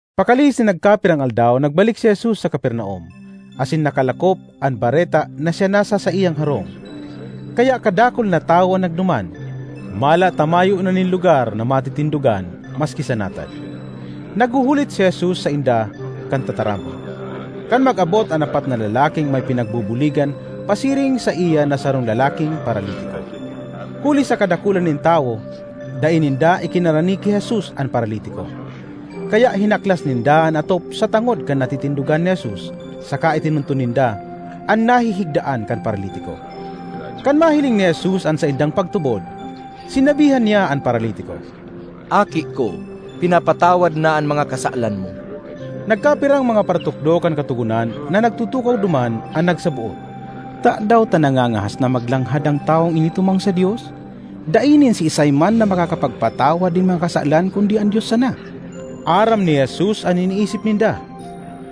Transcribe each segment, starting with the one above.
Pakalihis nin nagkapirang aldaw nagbalik si Jesus sa Capernaum asin nakalakop an bareta na siya nasa saiyang harong. Kaya kadakul na tawo an nagduman, mala ta mayo na nin lugar na matitindogan maski sa natad. Naghuhulit si Jesus sainda kan tataramon, kan mag-abot an apat na lalaking may pinagbubuligan pasiring saiya na sarong lalaking paralitiko. Huli sa kadakulan nin tawo, dai ninda ikinarani ki Jesus an paralitiko. Kaya hinaklas ninda an atop sa tangod kan natitindogan ni Jesus saka itinunton ninda an nahihigdaan kan paralitiko. Kan mahiling ni Jesus an saindang pagtubod, sinabihan niya an paralitiko, “Aki ko, pinapatawad na an mga kasalan mo.” Nagkapirang mga paratukdo kan Katogonan na nagtutukaw duman an nagsaboot: ”Tadaw ta nangangahas na maglanghad an tawong ini tumang sa Dios? Dai nin siisay man na makakapagpatawad nin mga kasalan kundi an Dios sana!” Aram ni Jesus an iniisip ninda,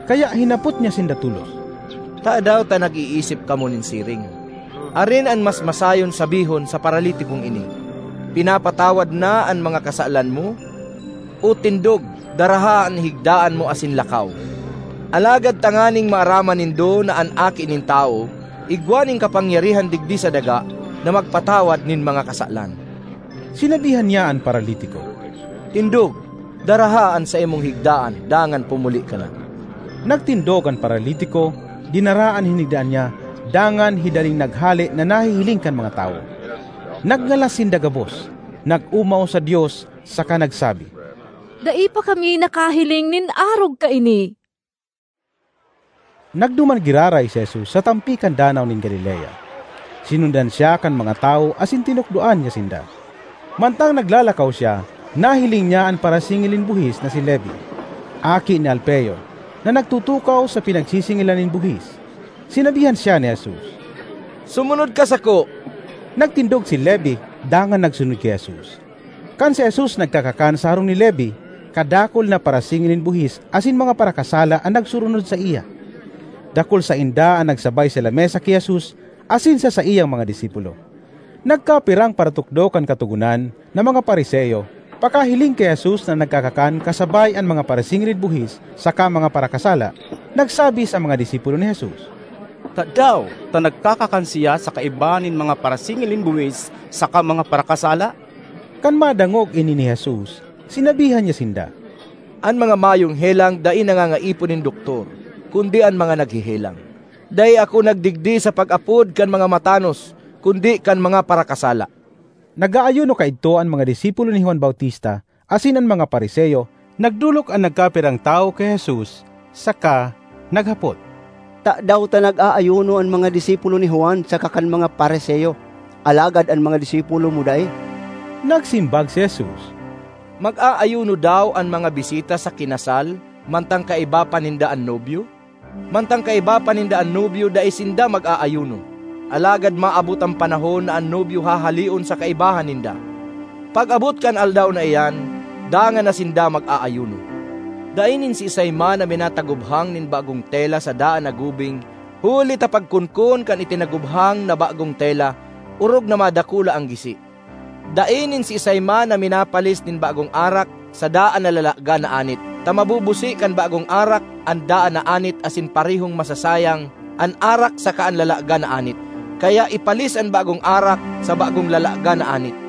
kaya hinapot niya sinda tolos, “Tadaw ta nag-iisip kamo nin siring? Arin an mas masayon sabihon sa paralitikong ini, ‘Pinapatawad na an mga kasalan mo,’ o ‘Tindog, daraha an higdaan mo asin lakaw’? Alagad tanganing maaraman nindo na an Aki nin Tawo igwa nin kapangyarihan digdi sa daga na magpatawad nin mga kasalan,” sinabihan niya an paralitiko, ”Tindog, daraha an saimong higdaan dangan pumuli ka na!” Nagtindog an paralitiko, dinara an hinigdaan niya dangan hidaling naghale na nahihiling kan mga tawo. Nagngalas sinda gabos, nag-omaw sa Dios saka nagsabi, “Dai pa kami nakahiling nin arog kaini!” Nagduman giraray si Jesus sa tampi kan Danaw nin Galilea. Sinundan siya kan mga tawo asin tinukdoan niya sinda. Mantang naglalakaw siya, nahiling niya an parasingil nin buhis na si Levi, aki ni Alfeo, na nagtutukaw sa pinagsisingilan nin buhis. Sinabihan siya ni Jesus, “Sumunod ka sako.” Nagtindog si Levi dangan nagsunod ki Jesus. Kan si Jesus nagkakakan sa harong ni Levi, kadakul na parasingil nin buhis asin mga parakasala an nagsurunod saiya; dakul sainda an nagsabay sa lamesa ki Jesus asin sa saiyang mga disipulo. Nagkapirang paratukdo kan Katogonan, na mga Fariseo, pakahiling ki Jesus na nagkakakan kasabay an mga parasingil nin buhis saka mga parakasala, nagsabi sa mga disipulo ni Jesus, “Tadaw ta nagkakakan siya sa kaibahan nin mga parasingil nin buhis saka mga parakasala?” Kan madangog ini ni Jesus, sinabihan niya sinda, “An mga mayong helang dai nangangaipo nin doktor kundi an mga naghehelang. Dai ako nagdigdi sa pag-apod kan mga matanos kundi kan mga parakasala.” Nag-aayuno kaidto an mga disipulo ni Juan Bautista asin an mga Fariseo kan nagdolok an nagkapirang tawo ki Jesus saka naghapot, “Tadaw ta nag-aayuno an mga disipulo ni Juan saka kan mga Fariseo, alagad an mga disipulo mo dai?” Nagsimbag si Jesus, “Mag-aayuno daw an mga bisita sa kinasal mantang kaiba pa ninda an nobyo? Mantang kaiba pa ninda an nobyo dai sinda mag-aayuno. Alagad maabot an panahon na an nobyo hahaleon sa kaibahan ninda. Pag-abot kan aldaw na iyan, dangan na sinda mag-aayuno. ”Dai nin siisay man na minatagubhang nin bagong tela sa daan na gubing huli ta pagkonkon kan itinagubhang na bagong tela, orog na madakula an gisi. Dai nin siisay man na minapalis nin bagong arak sa daan na lalagan na anit, ta mabubusi kan bagong arak an daan na anit asin parehong masasayang an arak saka an lalagan na anit. Kaya, ipalis an bagong arak sa bagong lalagan na anit.”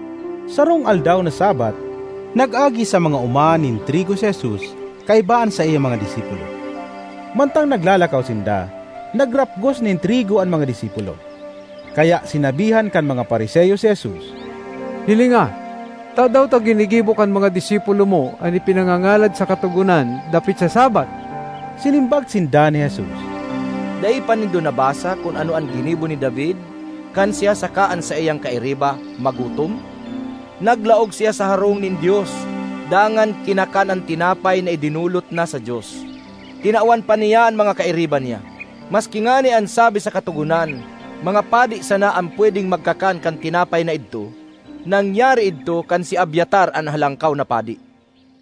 Sarong aldaw na Sabbath, nag-agi sa mga oma nin trigo si Jesus kaiba an saiyang mga disipulo. Mantang naglalakaw sinda, nagrapgos nin trigo an mga disipulo. Kaya sinabihan kan mga Fariseo si Jesus, “Hilinga, tadaw ta ginigibo kan mga disipulo mo an ipinangangalad sa Katogonan dapit sa Sabbath?” Sinimbag sinda ni Jesus, “Dai pa nindo nabasa kun ano an ginibo ni David kan siya saka an saiyang kairiba magutom? Naglaog siya sa harong nin Dios dangan kinakan an tinapay na idinolot na sa Dios; tinawan pa niya an mga kairiba niya. Maski ngani an sabi sa Katogonan mga padi sana an pwedeng magkakan kan tinapay na idto. Nangyari idto kan si Abiatar an Halangkaw na Padi.”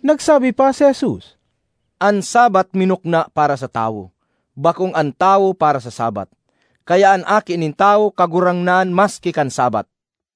Nagsabi pa si Jesus, “An Sabbath minukna para sa tawo; bakong an tawo para sa Sabbath. Kaya an Aki nin Tawo Kagurangnan maski kan Sabbath.”